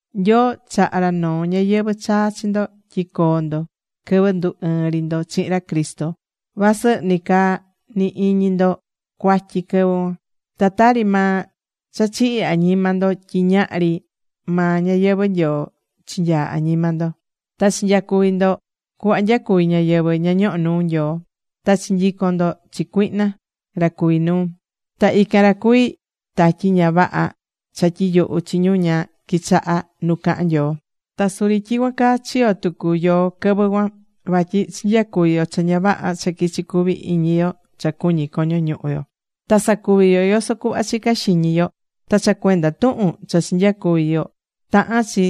Nyoo chaha̱ ra noo ñayɨvɨ̱ chaa chi ndo tyi coo ndo quɨvɨ ndu ɨɨ̱n ri ndo chihin ra Cristo, vasɨ nicaa ni iñi ndo cuatyi quɨvɨ cuan. Ta tari maa cha chihi̱ añima ndo tyi ñahri maa ñayɨvɨ̱ Nyoo chinyaa̱ añima ndo. Ta chinyacuvi̱ ndo cuhva nyacuví ñáyɨvɨ ña ñohó nuu Nyoo. Ta chinyico̱n ndo chi cuihna ra cuví nuu. Ta ican ra cuví tatyi ña vaha cha tyiyuhú chi ñu ña quichahá nu cahán Nyoo. Ta suri tyicuan caa chiyo̱ tucu yoó quɨvɨ cuan. Vatyi chinyacuvi̱ yo cha ña vaha cha quichi cuví iñi yo cha cuñí coño ñuhu yo. Ta sacuvi̱ yo yoso cuhva chica̱ xiñi yo. Ta cha cuenda tuhun cha chinyacuvi̱ yo tahán chi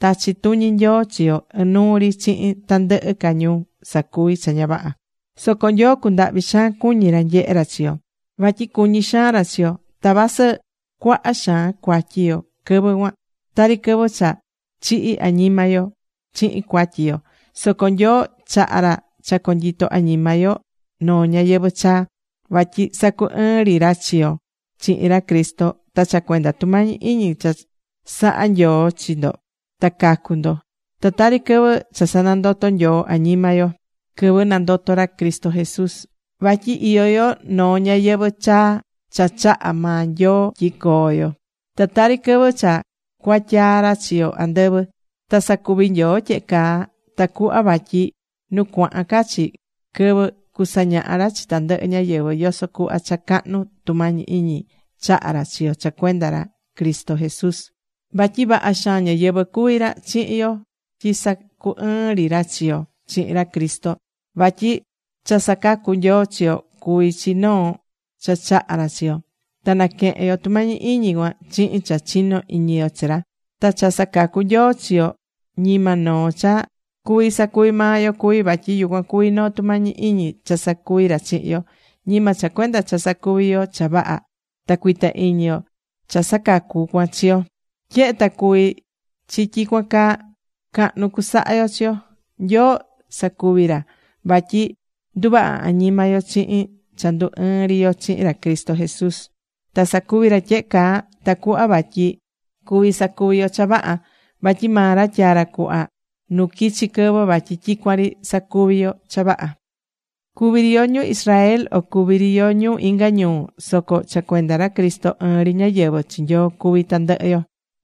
tachi tuñi Nyoo chi yo inuu ri chihin tandɨhɨ ca ñu sacuví cha ña vaha. Soco Nyoo cundahvi̱ xaan cuñi ra nyehe ra chi yo. Vatyi cuñí xaan ra chi yo. Ta vasɨ cuaha xaan cuatyi yo quɨvɨ cuan, tari quɨvɨ cha chihi̱ añima yo chihin cuatyi cuan, soco Nyoo chaha̱ ra cha conyito añima yo noo ñayɨvɨ̱ chaa, vatyi sacu ɨɨ̱n ri ra chi yo chihin ra Cristo. Ta cha cuenda tumañi iñi cha saha Nyoo chi ndo ta cacu̱ ndo. Ta tari quɨvɨ cha sanandoto̱ Nyoo añima yo quɨvɨ nandoto̱ ra Cristo Jesús. Vatyi iyó yo noo ñayɨvɨ̱ chaa cha chaha̱ maa Nyoo tyi coo yo. Ta tari quɨvɨ cha cuatyaa̱ ra chi yo andɨvɨ. Ta sacuvi̱ Nyoo tyehe caa tacuhva vatyi nu cuahán ca chi quɨvɨ cusañaha ra chi tandɨhɨ ñáyɨvɨ yoso cuhva cha cahnu tumañi iñi chaha̱ ra chi yo cha cuenda ra Cristo Jesús. Vatyi vaha xaan ñáyɨvɨ cuví ra chihin yo tyi sacu ɨɨ̱n ri ra chi yo chihin ra Cristo. Vatyi cha sacacú Nyoo chi yo cuví chi noo cha chahá ra chi yo. Ta naquehén yo tumañi iñi cuan chihin cha chinó iñi yo chi ra. Ta cha sacacú Nyoo chi yo ñima noo cha cuví sacuví maa yo cuví. Vatyi yucuan cuví noo tumañi iñi cha sacuví ra chihin yo. Ñima cha cuenda cha sacuví yo cha vaha ta cuita iñi yo cha sacacú cuan chi yo. Tyehe ta cuví chi tyicuan caa, cahnu cusaha yo chi yo. Nyoo sacuvi̱ ra vatyi nduvaha̱ añima yo chihin cha ndu ɨɨ̱n ri yo chihin ra Cristo Jesús. Ta sacuvi̱ ra tyehe caa tacuhva vatyi cuvi sacuvi yo cha vaha. Vatyi maa ra tyaa̱ ra cuhva nu quichi quɨvɨ vatyi tyicuan ri sacuvi yo cha vaha.Cuví ri yo ñu Israel, o cuví ri yo ñu inga ñuu, soco cha cuenda ra Cristo ɨɨn ri ñáyɨvɨ chi Nyoo cuví tandɨhɨ yo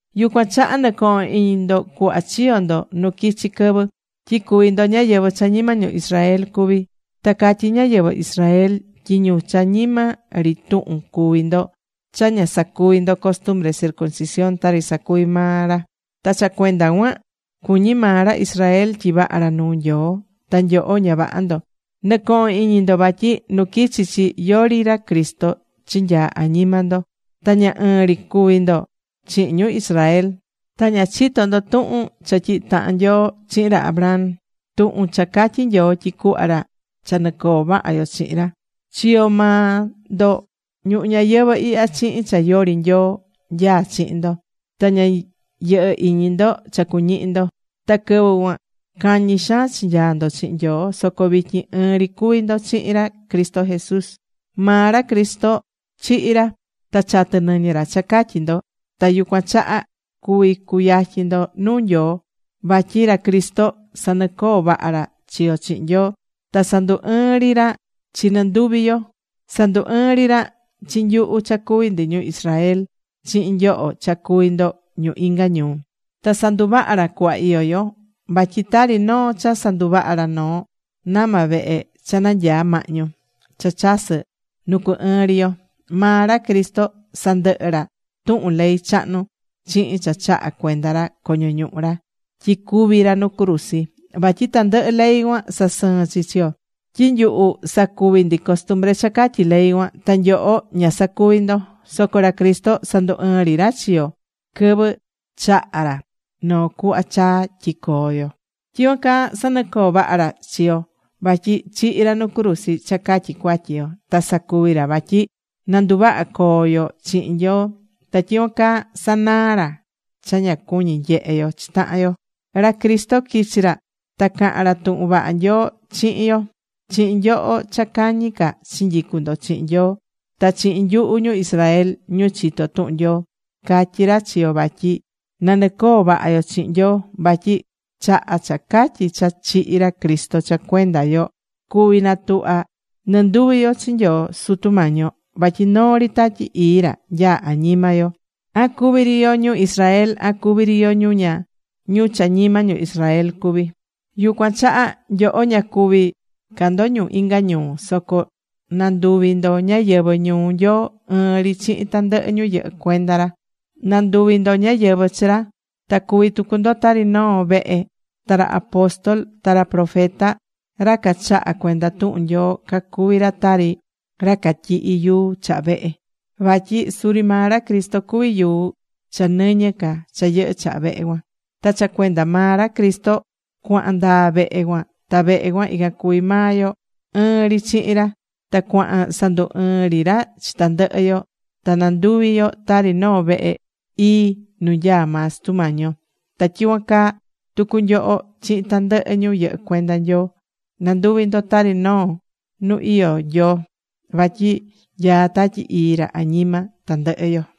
Yucuan chaha nɨ̱cohon iñi ndo cuhva chiyo̱ ndo nu quichi̱ quɨvɨ, tyi cuví ndo ñáyɨvɨ cha ñima ñu Israel cuví. Ta catyí ñáyɨvɨ Israel tyi ñu cha ñima ri tuhun cuví ndo cha ña sacuví ndo costumbre circuncisión tari sacuví maa ra. Ta cha cuenda cuan cuñí maa ra Israel tyi vaha ra nuu Nyoo ta nyoho ña vaha ndo. Nɨ̱cohon iñi ndo vatyi nu quichi chi, yori ra Cristo chinyaa̱ añima ndo. Ta ña ɨɨn ri cuvi̱ ndo chihin ñu Israel. Ta ña chito̱ ndo tuhun cha tyihi̱ tahan Nyoo chihin ra Abraham: tuhun cha catyí Nyoo tyi cuhva ra cha nɨcoo vaha yo chihin ra. Chiyo̱ maa ndo ñuhu ñayɨvɨ̱ ihya chihin cha yori Nyoo nyaá chihin ndo, ta ña yɨhɨ́ iñi ndo cha cuñihi ndo. Ta quɨvɨ cuan cañi xaan chinyaa̱ ndo chihin Nyoo. Soco vityin ɨɨn ri cuví ndo chihin ra Cristo Jesús. Maa ra Cristo chihi̱ ra. Ta chatɨ nɨñɨ ra cha catyi ndo. Ta yucuan chaha cuvi̱ cuyatyin ndo nuu Nyoo. Vatyi ra Cristo sanɨcoo̱ vaha ra chi yo chihin Nyoo. Ta sandu ɨɨ̱n ri ra chi nɨnduvi yo. Sandu ɨɨ̱n ri ra chi nyuhu cha cuví ndi ñu Israel chihin nyoho cha cuví ndo ñu inga ñuu. Ta sanduvaha̱ ra cuhva iyó yo. Vatyi tari noo cha sanduva̱ ra noo nama vehe cha nanyaa̱ mahñu, cha chasɨ̱ nu cu ɨɨn ri yo. Maa ra Cristo sandɨhɨ̱ ra tuhun ley chahnu chihin cha chaha̱ cuenda ra coño ñuhu ra tyi cúvi ra nu cruzi. Vatyi tandɨhɨ ley cuan sasɨɨ̱n chi chi yo. Tyi nyuhu sacuvi̱ ndi costumbre cha catyí ley cuan. Ta nyoho ña sacuvi̱ ndo. Soco ra Cristo sandu ɨɨ̱n ri ra chi yo quɨvɨ chaha̱ ra noo cuhva chaa tyi coo yo. Ta tyicuan caa sanɨcoo̱ vaha ra chi yo. Vatyi chihi̱ ra nu cruzi cha catyi cuatyi yo. Ta sacuvi ra vatyi nanduvaha coo yo chihin Nyoo. Ta tyicuan caa sanaa̱ ra cha ña cuñi̱ nyehe yo chi tahan yo. Ra Cristo quichi̱ ra ta caha̱n ra tuhun vaha Nyoo chihin yo: chihin nyoho cha cañi ca chinyicu̱ ndo chihin Nyoo ta chihin nyuhu ñu Israel, ñu chitó tuhun Nyoo. Catyi̱ ra chi yo vatyi na nɨcoo vaha yo chihin Nyoo. Vatyi chaha cha catyi cha chihi̱ ra Cristo cha cuenda yo cuví natuhva nɨnduvi yo chi Nyoo Sutu yo. Vatyi noo ri Tatyi Ii ra nyaá añima yo: an cuví ri yo ñu Israel, an cuví ri yo ñu cha ñima ñu Israel cuví. Yucuan chaha nyoho ña cuví ca ndo ñu inga ñuu. Soco nanduvi̱ ndo ñáyɨvɨ ñuu Nyoo ɨɨn ri chihin tandɨhɨ ñu yɨhɨ́ cuenda ra. Nanduvi̱ ndo ñáyɨvɨ chi ra. Ta cuví tucu ndo tari noo vehe. Ta ra apóstol, ta ra profeta, ra cachahá cuenda tuhun Nyoo cacuví ra tari ra catyihi̱ yuu chaha vehe. Vatyi suri maa ra Cristo cuví yuu cha nɨñɨ ca cha yɨhɨ́ chaha vehe cuan. Ta cha cuenda maa ra Cristo cuahan ndaa vehe cuan ta vehe cuan ican cuví maa yo ɨɨn ri chihin ra. Ta cuahán sandu ɨɨn ri ra chi tandɨhɨ yo ta nanduví yo tari noo vehe ii nu nyaá maa Sutu Mañi yo. Ta tyicuan caa tucu nyoho chihin tandɨhɨ ñu yɨhɨ́ cuenda Nyoo, nanduví ndo tari noo nu iyó Nyoo. Vatyi nyaá Tatyi Ii ra añima tandɨhɨ yo.